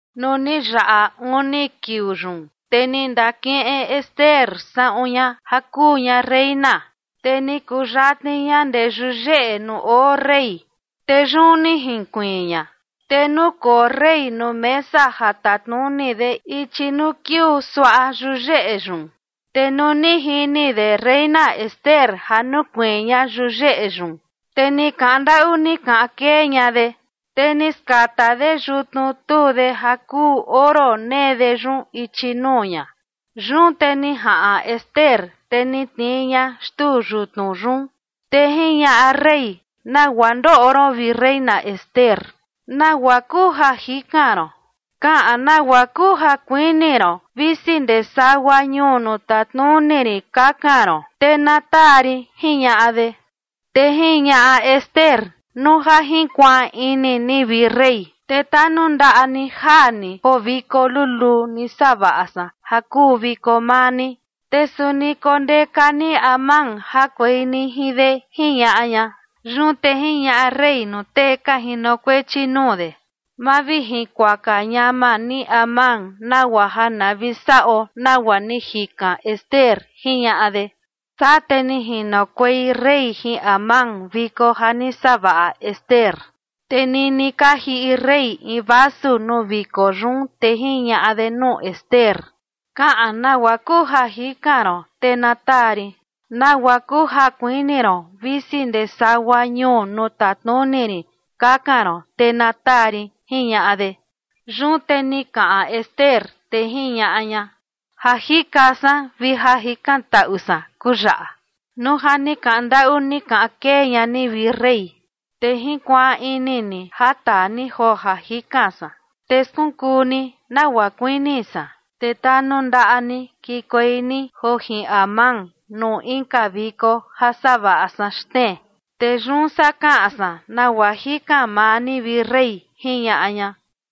Nuu ni yaꞌa uni kiuu yun, te ni ndakiꞌin Ester saꞌun ña ja kuu ña reina, te ni kuyatni ña ndee yuyeꞌe nuu oo rey, te yun ni jinkuiin ña. Te nukoo rey nuu mesa ja tatnuni de ichi nuu kiuu suaꞌa yuyeꞌe yun. Te nuu ni jini de reina Ester ja nukuiin ña yuyeꞌe yun, te ni kaꞌan ndaꞌu ni kaꞌan kee ña de, te ni skata de yutnu tuu de ja kuu oro nee de yun ichi nuu ña. Yun te ni jaꞌan Ester, te ni tnii ña xtuu yutnu yun. Te jiñaꞌa rey: ―¿Nagua ndoꞌo ron, vi reina Ester? ¿Nagua kuu ja jikan ron? Kaꞌan nagua kuu ja kuini ron visi ndee sagua ñuu nuu tatnuni rin kakan ron, te na taa rin ―jiñaꞌa de. Te jiñaꞌa Ester: ―Nuu ja jinkuaan ini ni, vi rey, te tanundaꞌa ni jaa ni joo viko luluu ni savaꞌa san ja kuu viko maa ni, te suni kondeka ni Amán jakuei ni jin de ―jiñaꞌa ña. Yun te jiñaꞌa rey nuu tee ka jinokuechi nuu de: ―Mavijinkuaka ñama ni Amán nagua ja na vi saꞌo nagua ni jikan Ester ―jiñaꞌa de. Saa te ni jinokuei rey jin Amán viko ja ni savaꞌa Ester. Te nini ka jiꞌi rey in vasu nuu viko yun, te jiñaꞌa de nuu Ester: ―Kaꞌan nagua kuu ja jikan ron, te na taa rin. Nagua kuu ja kuini ron visi ndee sagua ñuu nuu tatnuni rin kakan ron, te na taa rin ―jiñaꞌa de. Yun te ni kaꞌan Ester, te jiñaꞌa ña: ―Ja jikan san vi ja jikantaꞌu san kuu yaꞌa: Nuu ja ni kaꞌan ndaꞌu ni kaꞌan kee ña ni, vi rey, te jinkuaan ini ni ja taa ni joo ja jikan san, te skunkuu ni nagua kuini san, te tanundaꞌa ni kikuei ni joo jin Amán nuu inka viko ja savaꞌa san xtnee. Te yun saa kaꞌan san nagua jikan maa ni, vi rey ―jiñaꞌa ña.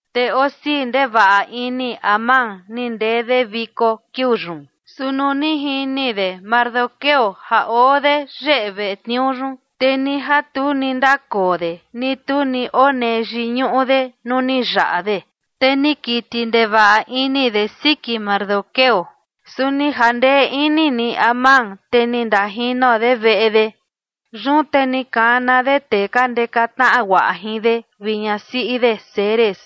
Te osii ndevaꞌa ini Amán ni ndee de viko kiuu yun. Su nuu ni jini de Mardoqueo ja oo de yeꞌe veꞌe tniuu yun, te ni ja tu ni ndakoo de ni tu ni onee yiñuꞌu de nuu ni yaꞌa de, te ni kiti ndevaꞌa ini de siki Mardoqueo. Su ni jandee ini ni Amán, te ni ndajino de veꞌe de. Yun te ni kana de tee ka ndeka tnaꞌa guaꞌa jin de vi ñasiꞌi de Zeres.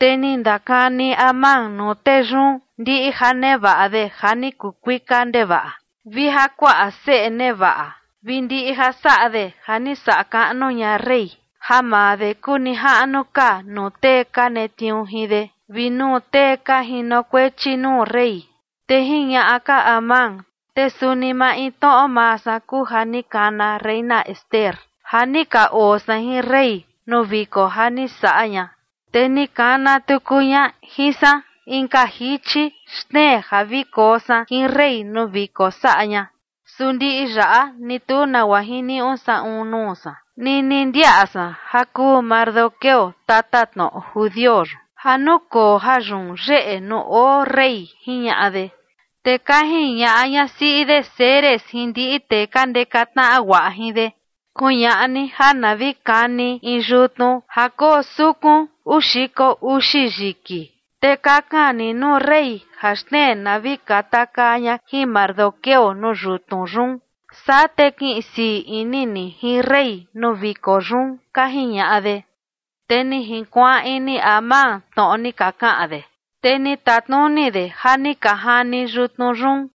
Te ni ndakani Amán nuu tee yun ndiꞌi ja nevaꞌa de ja ni kuu kuika ndevaꞌa vi ja kuaꞌa seꞌe nevaꞌa vi ndiꞌi ja saꞌa de ja ni saꞌa kaꞌnu ña rey, ja maa de kuu nijaꞌnu ka nuu tee ka netniuu jin de vi nuu tee ka jinokuechi nuu rey. Te jiñaꞌa ka Amán: ―Te suni maintnoꞌo maa san kuu ja ni kana reina Ester ja ni ka oo san jin rey nuu viko ja ni saꞌa ña. Te ni kana tuku ña jin san inka jichi xtnee ja vi koo san jin rey nuu viko saꞌa ña. Su ndiꞌi yaꞌa ni tu nagua jiniuꞌu saꞌun nuu san nini ndiaꞌa san ja kuu Mardoqueo, tatatnoꞌo judio yun, ja nukoo jayun yeꞌe nuu oo rey ―jiñaꞌa de. Te ka jiñaꞌa ñasiꞌi de Zeres jin ndiꞌi tee ka ndeka tnaꞌa guaꞌa jin de: ―Kuñaꞌa ni ja na vi kani in yutnu ja koo sukun uu xiko uxi yiki. Te kakan ni nuu rey ja xtnee na vi katakaa ña jin Mardoqueo nuu yutnu yun. Saa te kiꞌin sii ini ni jin rey nuu viko yun ―ka jiñaꞌa de. Te ni jinkuaan ini Amán tnoꞌo ni ka kaꞌan de, te ni tatnuni de ja ni ka jani yutnu yun.